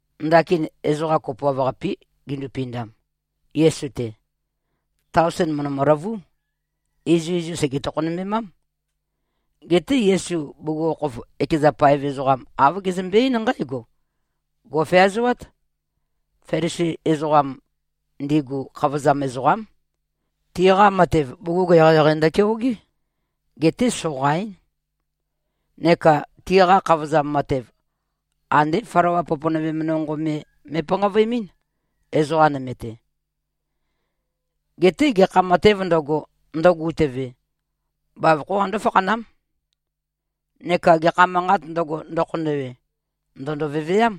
Ndakin ezoqa kopoav-qapé gindupindam, Yesu-te. Taosen mø̀ndømø-løvú. Izuizum sège-tokhonømbemám. Geté Yesu bugukhokhof ekeza paev ezoqam, āv gezømbe-eín nqǽgo, “Gò꞉feazoát. Felisi ezoqam ndigu, khavozam ezoqám. Tiqa matev, bugug eqeieqei ndøkeogé. Geté soqaín. Neka tiqa khavozam matev, andé flawa poponøvem nonqo me me꞉panqavøemɨ́n, ezoqa nøme-te. Geté gekha matēv ndøgo, ndøgutøve, bavokhó qandó-fakhanám. Neka gekha manqāt ndøgo, ndøkhonøwe, ndø̀ndo-veveám.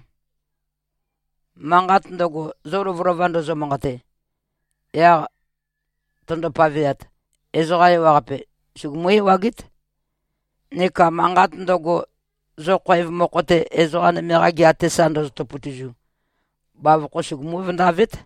Manqat ndøgo, zo lovølova ndozo-manqate, yaq tøndo-paveat, ezoqa ewaqape sugumú-ewagét. Neka manqat ndøgo, zo khoev mokho-te, ezoqa nøme-qa gea-te sa ndozoto-potozu, bavokhó sugumú-vøndavét.”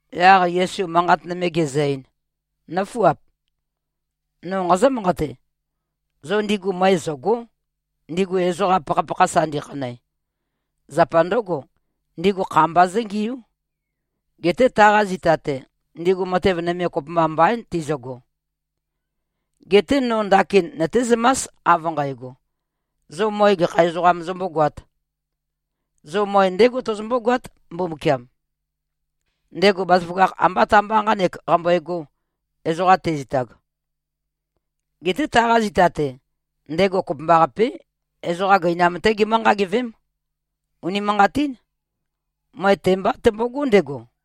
Yaq Yesu manqat nøme gezø-ein, “Nǿfuap! No nqazǿ-manqate: Zo ndigu møe zø̀go᷄, ndigu ezoqa pakhapakha sa ndikhanæ. Zapa ndǿgo, ndigu kha mba zǿngiú. Geté taqa zita-te, ndigu matev nøme kopømba mbaín tizøgo. Geté no ndakin nøtézømás av nqægo, zo møe gekha ezoqām zombógoāt. Zo møe ndégo tozombó-goát, Mbumbukiam. Ndego bazaføgakh ambá ta-mba nqānek, qambøegō, ezoqa tezitag. Geté taqa zita-te, ndego kopømbaqapé, ezoqa gøinam-té gemǿ-nqagivém. Unimanqatín. Møe te-mbá tømbogó ndego.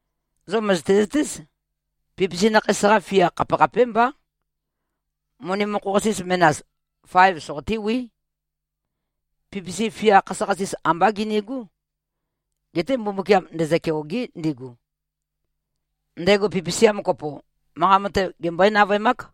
Zo mø̀zøte-zøtéz. Pipisi nakheis-qa fia khapekhapémbá. Moni mokho-qasis menas, faev soqotéwí. Pipisi, fia khasøkhasis ambá ginigú. Geté Mbumbukiam ndezø-keôgé, ndigu. Ndego pipisiam kopo, manqa mate gembøé-navøemák.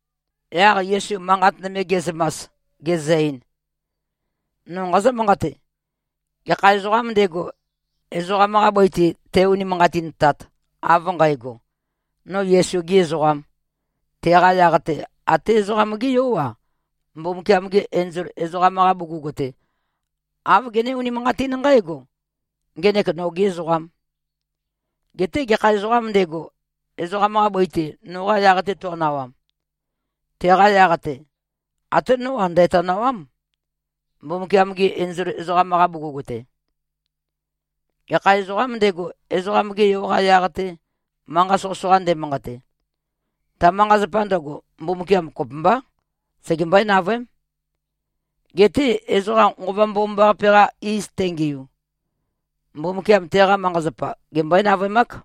Yaq Yesu manqat nøme ge꞉zømas, gezø-ein, “No nqazǿ-manqate: Gekha ezoqām ndego, ezoqam-qa bøi-te te-unimanqatintat, av nqægo, ‘No Yesu-gē ezoqām,’ teqa yaq-te, até Ezoqam-gé Yó-a, Mbumbukiam-gi enzol ezoqam-qa bugug-te, āv gené-unimanqatín nqǽgo, ‘Ngenek nogē ezoqām.’ Geté gekha ezoqām ndego, ezoqam-qa bøi-te noqa yaq-te to꞉nawam, teqa yaq-te, até nó-a, ndæ̀tonawám, Mbumbukiam-gi enzol ezoqam-qa bugug-te. Gekha ezoqām ndego, Ezoqam-ge Yo-qa yaq-te, manqa soqøsoqa ndemanqate, ta manqa-zapa ndøgo, Mbumbukiam kopømbá, segembøé-navøém. Geté ezoqa Nqova Mbomambaqape-qa iz tengiu, Mbumbukiam teqa manqa-zapa gembøé-navøemák.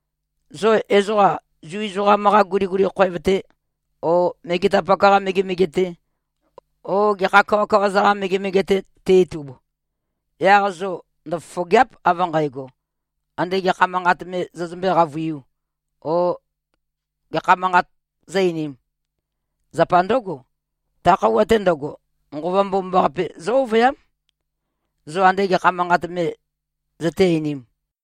Zo ezoqa Zu ezoqam-qa guliguli khoev-te o megetapak-qa megemege-te o gekha kawakawa-za-qa megemege-te ti-itub, yaq zo ndøfofògea᷄p av nqægo, ande gekha manqat me zozømbé-qavøiū o gekha manqat zó-einīm. Zapa ndǿgo, ta khøuwa-te ndøgo, Nqova Mbomambaqape zǿ-ovøyám, zo ande gekha manqat me zøté-einīm.”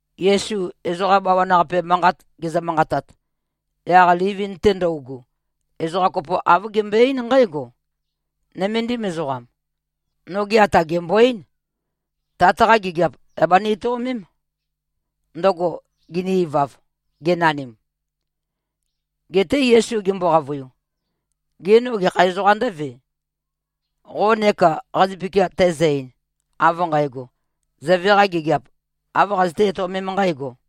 Yesu ezoqa bawan-qape manqat gezø-manqatat, yaq livin-te ndøugu, ezoqa kopo āv gembøe-eín nqǽgo, “Nøméndim ezoqam, noge ata gèmbo-eín, tat-qa gigiap, yà bani-etøomém, ndøgo gini-ivav, genanim.” Geté Yesu gembo-qavøiu, “Gê, no gekha ezoqām ndǿve, qo neka qazøpikia tæzø-ein, av nqægo, ‘Zøve-qa gigiap āv qazøtē-etøomēm nqǣgo’?”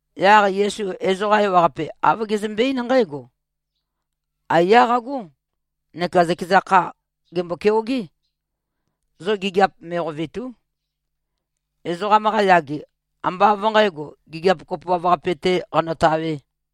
Yaq Yesu ezoqa ewaqape, āv gezømbe-eín nqǽgo, “Aiyá qagó neka zøkeza kha, gèmbo-keogé. Zo gigiap me꞉qovètu᷄. Ezoqam-qa yage, ambá av nqǣgo, gigiap kopoav-qape-tē qanotawē.”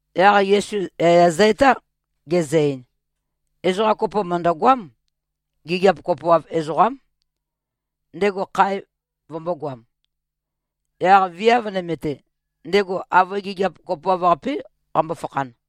Yaq Yesu yaya zø-etá, gezø-ein, “Ezoqa kopo mø̀ndøgoám. Gigiap kopoav ezoqám. Ndego khae vømbōgoam. Yaq viav nøme-te, ndego avøe gigiap kopoav-qapé qambo-fakhan.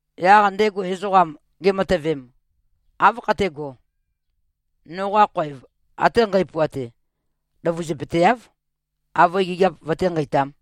Yaq ndego ezoqam gematøvem, ‘Áv khatégō? Noqa khoev ate nqæpuate løvøzupøteáv, avøe gigiap vøté-nqeitām.’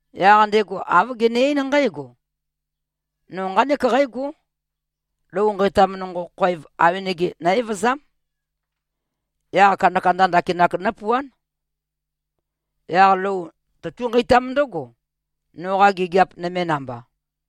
Yaq ndego āv gene-eín nqǽgo, ‘No nqánek qǽgó. Lou nqeitam khoev awenege nó-evøzám. Yaq kandakanda ndakinak nópuán. Yaq lou tøtú꞉-nqeitám ndǿgo, noqa gigiap nøme namba.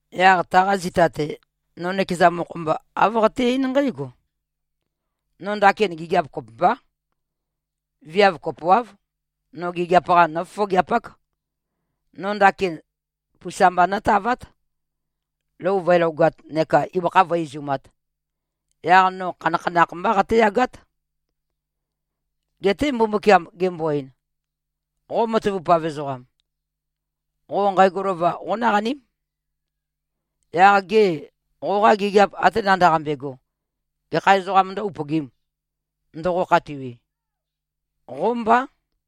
Yaq taqa zita-te, no nøkeza mokho-mba āv qaté-eín nqǽgo, “No ndakin gigiap kopømbá. Viav kopoáv, no gigiap-qa nófofogeapák. No ndakin pusa mba nótavát, lou vǿelogāt neka ibøkha vǿe-izumāt. Yaq no khanakhanakh mbá qatéyagát.” ’ Geté Mbumbukiam gembo-ein, ‘Qo matavupav ezoqam, qo nqægo lova qónaqaním. Yaq gê, qoqa gigiap ate nandaqambe꞉go, gekha ezoqām ndǿ-upøgīm, ndoqo-khatiwi? Qó mbá!’”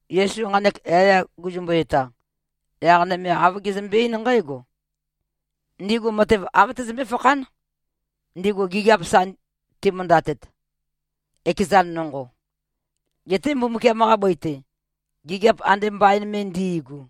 Yesu nqanek yaya guzumbu-eta, yaq nøme āv gezømbe-eín nqǽgo, “Ndigu matev āv tøzømbé-fakhán, ndigu gigiap sa timøndatet, ekezan nonqo, getē Mbumbukiam-qa bøi-te, gigiap ande mbain me ndi꞉gu.”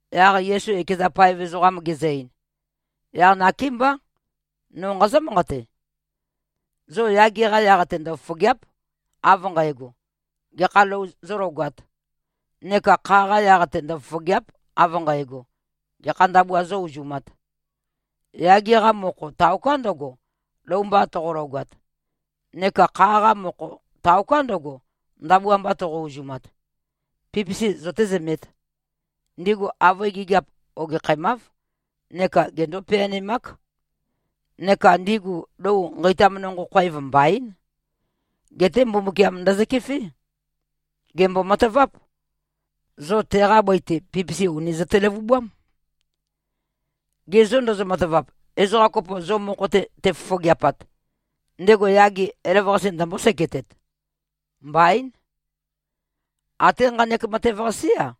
Yaq Yesu ekeza paev ezoqam gezø-ein, “Yaq nakémbá, no nqazǿ-manqate: Zo yage-qa yaq-te ndøfofògea᷄p, av nqægo, gekha lou zólogāt. Neka kha-qa yaq-te ndøfofògea᷄p, av nqægo, gekha ndabua zó-uzumāt. Yage-qa mokho, taoká ndøgo, lou mba toqologat. Neka kha-qa mokho, taoká ndøgo, ndabua mba toqo-uzumat. Pipisi zøtézømēt! Ndigu avøe gigiap ogekhæmáv, neka gendó-peanemák. Neka ndigu lou nqeitam nonqo khoev mbaín. Geté Mbumbukiam ndøzøkefé. Gèmbo-mataváp. Zo teqa bøi-te, pipisi ùni zøte-løvubám. Ge zô ndozo-matavap, ezoqa kopo zo mokho-te tefofogeapat, ndego yage elavøqase ndømbó-seketet? Mbaín! Até nqanek matev-qasé-a,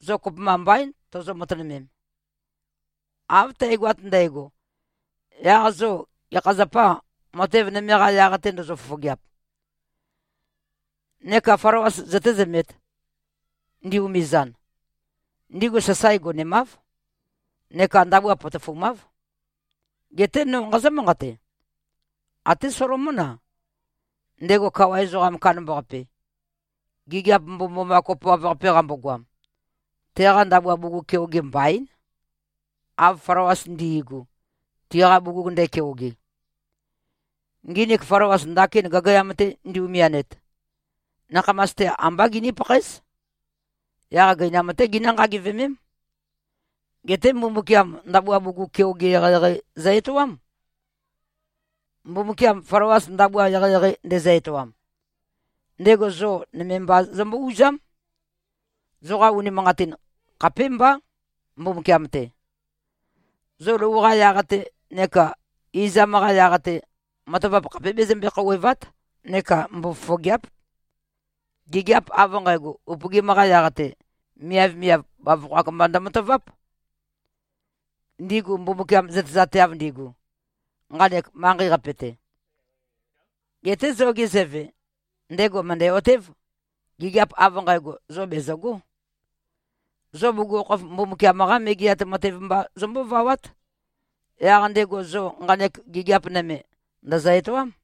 zo kopømba mbaín, tozo-matønømem. Av tægoat ndægo, yaq zo gekha zapâ, matev nøme-qa yaq-te ndozo-fofogeap? Neka flawas zøtézømēt, ndi-umizan. Ndigu sasae gonemáv neka ndabua potofumáv. Geté no nqazǿ-manqate: Até Solomón-a, ndego kawa ezoqam kandambaqape, gigiap mbomømboma kopoav-qape qambogoam, teqa ndabua bugug keoge mbaín, av flawas ndi꞉gu, tiqa bugug ndækeoge. Nginik flawas, ndakin gagayag-te ndi-umianet, nakhamas-te ambá giní-pakhaéz, yaq gøinam-té ginǿ-nqagivemém. Geté Mbumbukiam ndabua bugug keoge eqeieqei zø-etoám. Mbumbukiam flawas ndabua eqeieqei ndezø-etoam, ndego zo nøme mba zømbó-uzám. Zoqa unimanqatin khapémbá, Mbumbukiam-te. Zo lou-qa yaq-te neka izam-qa yaq-te, matavap khapé bezømbe-khouwèva᷄t neka mbofofogèa᷄p. Gigiap av nqægo upøgim-qa yaq-te, miavmiav bavokho-ak mba ndømataváp, ndigu Mbumbukiam zøtezateav ndigu, nqanek manqei-qape-te. Geté zoge Zøve, ndego mø̀ndæ-otév, gigiap av nqægo, zo bèzøgó. Zo bugukhokhof Mbumbukiam-qá Megeat Matev mba zombóvawát. Yaq ndego zo nqanek gigiap nøme, ndø̀zø-etoám.”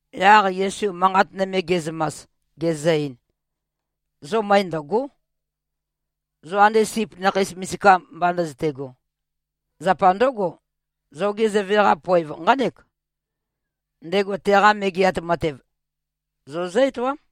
Yaq Yesu manqat nøme ge꞉zømas, gezø-ein, “Zo møe ndø̀go᷄, zo ande sip nakhei misika mba ndøzøte꞉go. Zapa ndǿgo, zoge Zøve-qa poev nqánek: Ndego teqa Megeat Matev zo zǿ-etoám.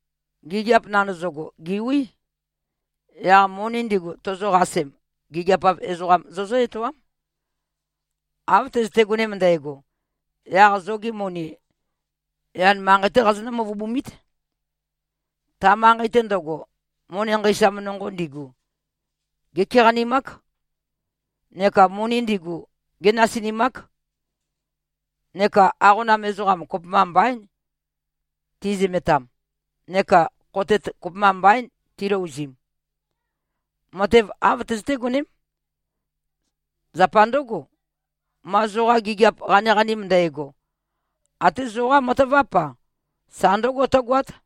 Gigiap nandøzøgo, gèwí. Yaq moni ndigu, tozoqasem, gigiap-av ezoqam zozǿ-etoám. Av tøzøte-gonem ndægo, yaq zogi moni, yan manqei-té qazonǿ-møvøbumít. Ta manqei-te ndøgo, moni nqeisam nonqo ndigu, gékeqanimák. Neka moni ndigu, génasinimák. Neka aqona ezoqam, kopømba mbaín, tizømetam, neka khotet kopømba mbaín, tilouzim. Matev āv tøzøté-goném. Zapa ndǿgo, ma zoqa gigiap qaniqanim ndægo, até zoqá mataváp-a, sa ndǿgo tǿgoát.”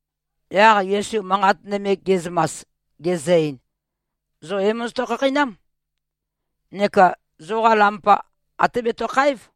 Yaq Yesu manqat nøme ge꞉zømas, gezø-ein, “Zo é-mozoto-khakheinám. Neka zoqa lampa até betøkháev.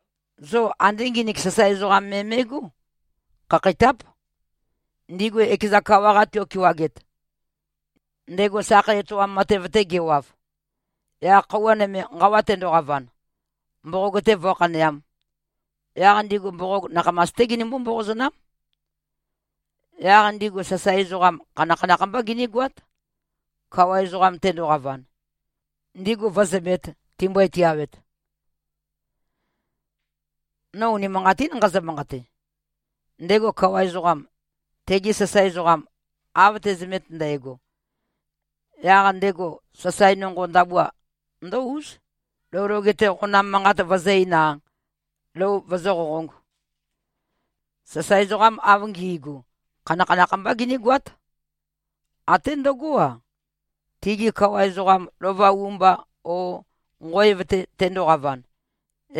Zo andé nginik sasae ezoqam me me꞉gó. Khakheitáp. Ndigu ekeza kawa-qa tiokewaget, ndego sakhei etoam matev-te gewav, yaq khøuwa nøme nqawa tendoqavan, mboqog-te vǿkhaneām, yaq ndigu mboqog nakhamas-té ginømbó-mboqozønám. Yaq ndigu sasae ezoqam khanakhanakh mbá ginígoát, kawa ezoqam tendoqavan, ndigu vǿzømēt, timbøe-tiawet. No unimanqatín nqazø-manqate. Ndego kawa ezoqam, tegi sasae ezoqam av te꞉zømet ndægo, yaq ndego sasae nonqo ndabua ndǿ-úz, lou loge-te qonam manqat vøzǿ-eīn-a, lou vøzǿ-qoqōng. Sasae ezoqam av ngi꞉gu, khanakhanakh mbá ginígoát, até ndøgó-a, tigi kawa ezoqam lova u-mba o nqoev-te tendoqavan,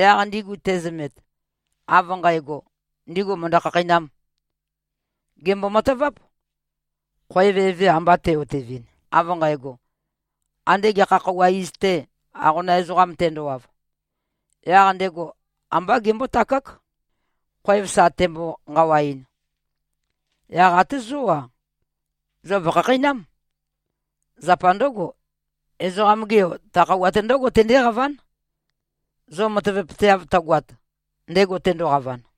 yaq ndigu tezømet, av nqægo, ndigu mø̀ndo꞉-khakheinām. Gèmbo-mataváp: Khoev eve amba te꞉-otevɨn, av nqægo, ande gekha khøuwa iz-te, aqonam ezoqam tendowav, yaq ndego ambá gembótakák, khoev sa tembo-nqawaɨn. Yaq até zó-a, zo vò꞉khakheinám. Zapa ndǿgo, Ezoqam-ge Yo, ta khøuwa-te ndǿgo tendéqaván, zo matavapøteav tøgoat, ndego tendoqavan.”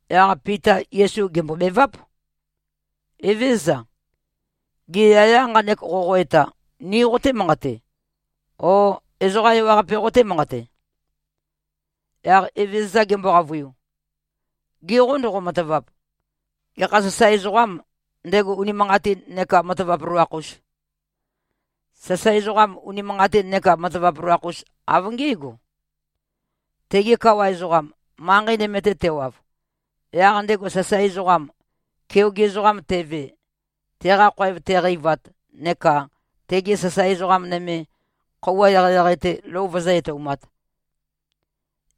Yaq Pita Yesu gèmbobeváp, “Evézøza. Gê, yaya nqanek qoqo-eta, ni qoté-manqate, ó, ezoqa ewaqape qotē-manqate?” Yaq Evezøza gembo-qavøiu, “Ge qô ndoqo-matavap? Gekha sasae ezoqâm, ndego unimanqatin neka matavap loloakh-us? Sasae ezoqam unimanqatin neka matavap loloakh-us, av ngé꞉go. Tege kawa ezoqam, manqei nøme-te tewav, yaq ndego sasae ezoqam, keoge ezoqam teve, teqa khoev teqeivat neka tegi sasae ezoqa nøme, khøuwa eqeieqei-te lou vøzǿ-etoumāt,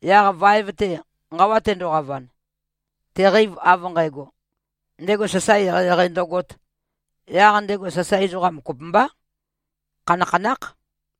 yaq vaev-te nqawa tendoqavan, teqeiv av nqægo, ndego sasae eqeieqei ndøgōt, yaq ndego sasae ezoqam kopømbá, khanakhanákh.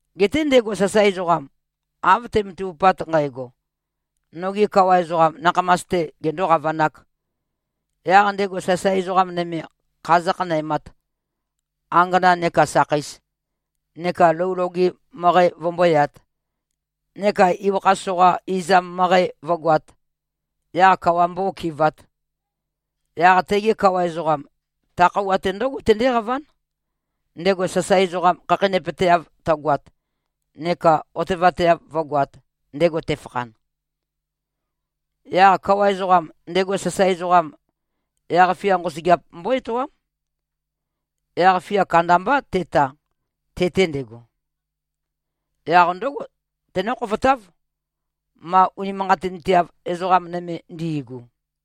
Geté ndego sasae ezoqam, av te꞉matavupat nqægo, noge kawa ezoqam nakhamas-te gendō-qavanāk, yaq ndego sasae ezoqa nøme kha zǿkhanæmāt, angana neka sakheis, neka lou loge møqæ vømbóyāt neka ibøkha soqa izam møqæ vǿgoāt, yaq kawa mbó-okɨvāt, yaq tege kawa ezoqam, ta khøuwa-te ndǿgo tendéqaván, ndego sasae ezoqam khakheinøpøteav tøgoat neka otevateav vǿgoāt, ndego tefakhan. Yaq kawa ezoqam, ndego sasae ezoqam, yaq-fia nqosøgeap mbó-etoám. Yaq-fia kandambá teta, te-te ndego. Yaq ndǿgo tenǿ-khofotáv, ma unimanqatinteav ezoqa nøme ndi꞉gu.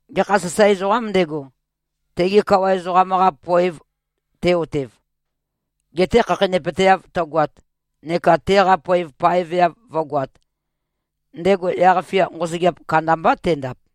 Gekha sasae ezoqām ndego, tege kawa ezoqam-qa poev te-otev, gete khakheinøpøteav tøgoat neka teqa poev paeveav vǿgoāt, ndego yaq-fia nqosøgeap kandambá tendap.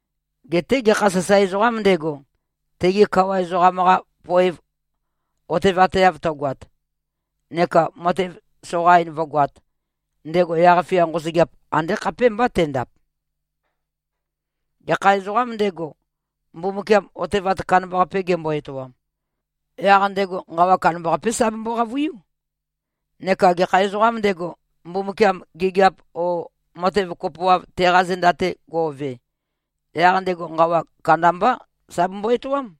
Geté gekha sasae ezoqām ndego, tege kawa ezoqam-qa poev otevateav tøgoat, neka matev soqain vǿgoāt, ndego yaq-fia nqosøgeap andé khapémbá tendap. Gekha ezoqām ndego, Mbumbukiam otevat kandambaqape gembo-etoam, yaq ndego nqawa kandambaqapé sa bembo-qavøiú. Neka gekha ezoqām ndego, Mbumbukiam gigiap o matev kopoav teqa zenda-te go꞉ve, yaq ndego nqawa kandambá sa bembo-etoám.”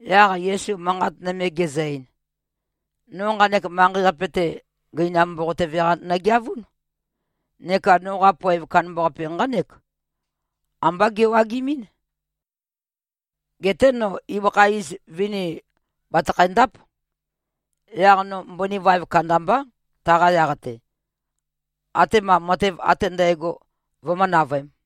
Yaq Yesu manqat nøme gezø-ein, “No nqanek manqei-qape-te, gøinam mboqotøve-qa nøgeavún. Neka noqa poev kandambaqape nqánek: Ambá gewagimín. Geté no ibøkha iz vini bàtøkhæ-ndáp. Yaq no mbøni vaev kandambá, taqa yaq-te, atema matev ate ndægo, vømǿ-navøēm.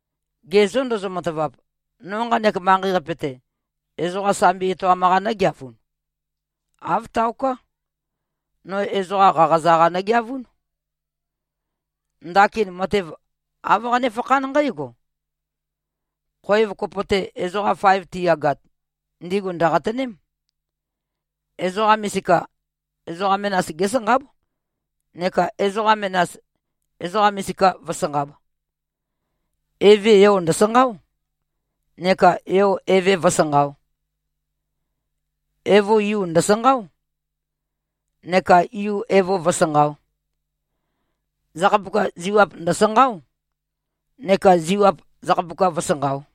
Ge zô ndozo-matavap, no nqanek manqei-qape-te, ezoqa sambi etoam-qa nø̄geavun? Āv taoká. No ezoqa qaqaza-qa nøgeavún. Ndakin matev āv qanéfakhán nqǽgo: Khoev kopo-te ezoqam faev tiyagat, ndigu ndø̀qatøném. Ezoqa misika, ezoqa menas gésanqáb, neka ezoqa menas, ezoqa misika vǿsanqāb. Eve yo ndø̀sanqáo, neka yo eve vǿsanqāo. Evo yu ndø̀sanqáo, neka yu evo vǿsanqāo. Zakhapuka ziwap ndø̀sanqáo, neka ziwap zakhapuka vǿsanqāo.”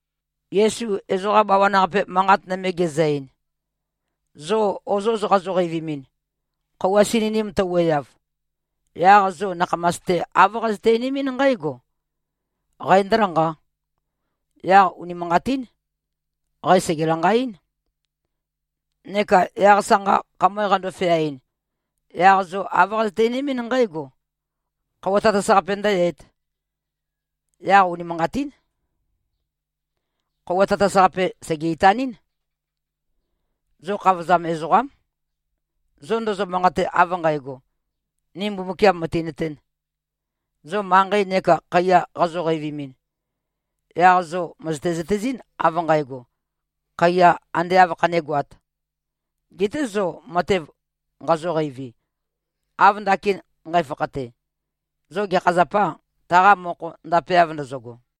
Yesu ezoqa bawan-qape manqat nøme gezø-ein, “Zo ozoz qazo-qeivimin, khøuwa sininim tøwuøyav, yaq zo nakhamas-te āv qazøte-einimín nqǽgo: Qæ ndø̄lanqā. Yaq unimanqatín. Qæ sège-lanqaɨ́n. Neka yaq sanqa khamøe qando-feaɨn, yaq zo āv qazøte-einimín nqǽgo: Khøuwa tatas-qape ndø̄yøēt. Yaq unimanqatín. Khøuwa tatas-qape sège-itanɨ́n. Zo khavozam ezoqám, zo ndozo-manqate av nqægo, ‘Ni Mbumbukiam mø̀tinøtēn.’ Zo manqei neka khaiya qazo-qeivimin, yaq zo mø̀zøte-zøtezɨ́n, av nqægo, khaiya ande āv khanégoāt. Geté zo matev nqazo-qeivi, av ndakin nqæfakhate, zo gekha zapâ, taqa mokho ndapeav ndozogo?”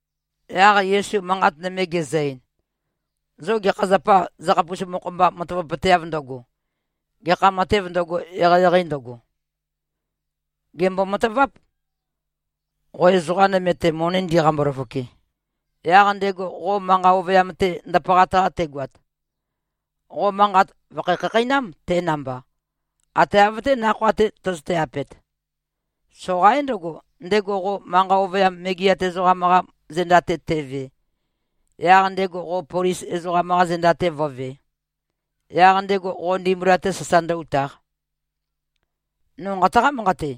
Yaq Yesu manqat nøme gezø-ein, “Zo gekha zapâ, zøkhapus mokho-mba matavapøteav ndøgo, gekha matēv ndøgo, eqeieqei ndøgo? Gèmbo-mataváp. Qo ezoqa nøme-te moni ndiqambo-løfoke, yaq ndego qo manqa ovøyam-te ndapaqat-qa tegoat, qo manqat vø̀kho-khakheinám, te namba, ate av-té nakhoa-te tøzøte-apet. Soqaín ndøgo, ndego qo manqa ovøyam megeat ezoqam-qa zenda-te teve, yaq ndego qo polis ezoqam-qa zenda-te vǿvē, yaq ndego qo ndimbula-te sasa ndǿ-utāq. No nqataqá-manqate.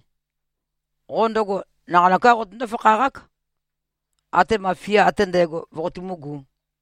Qo ndøgo naqanøká qotøndó-fakhaqák, atema fia ate ndægo voqotumúgū.”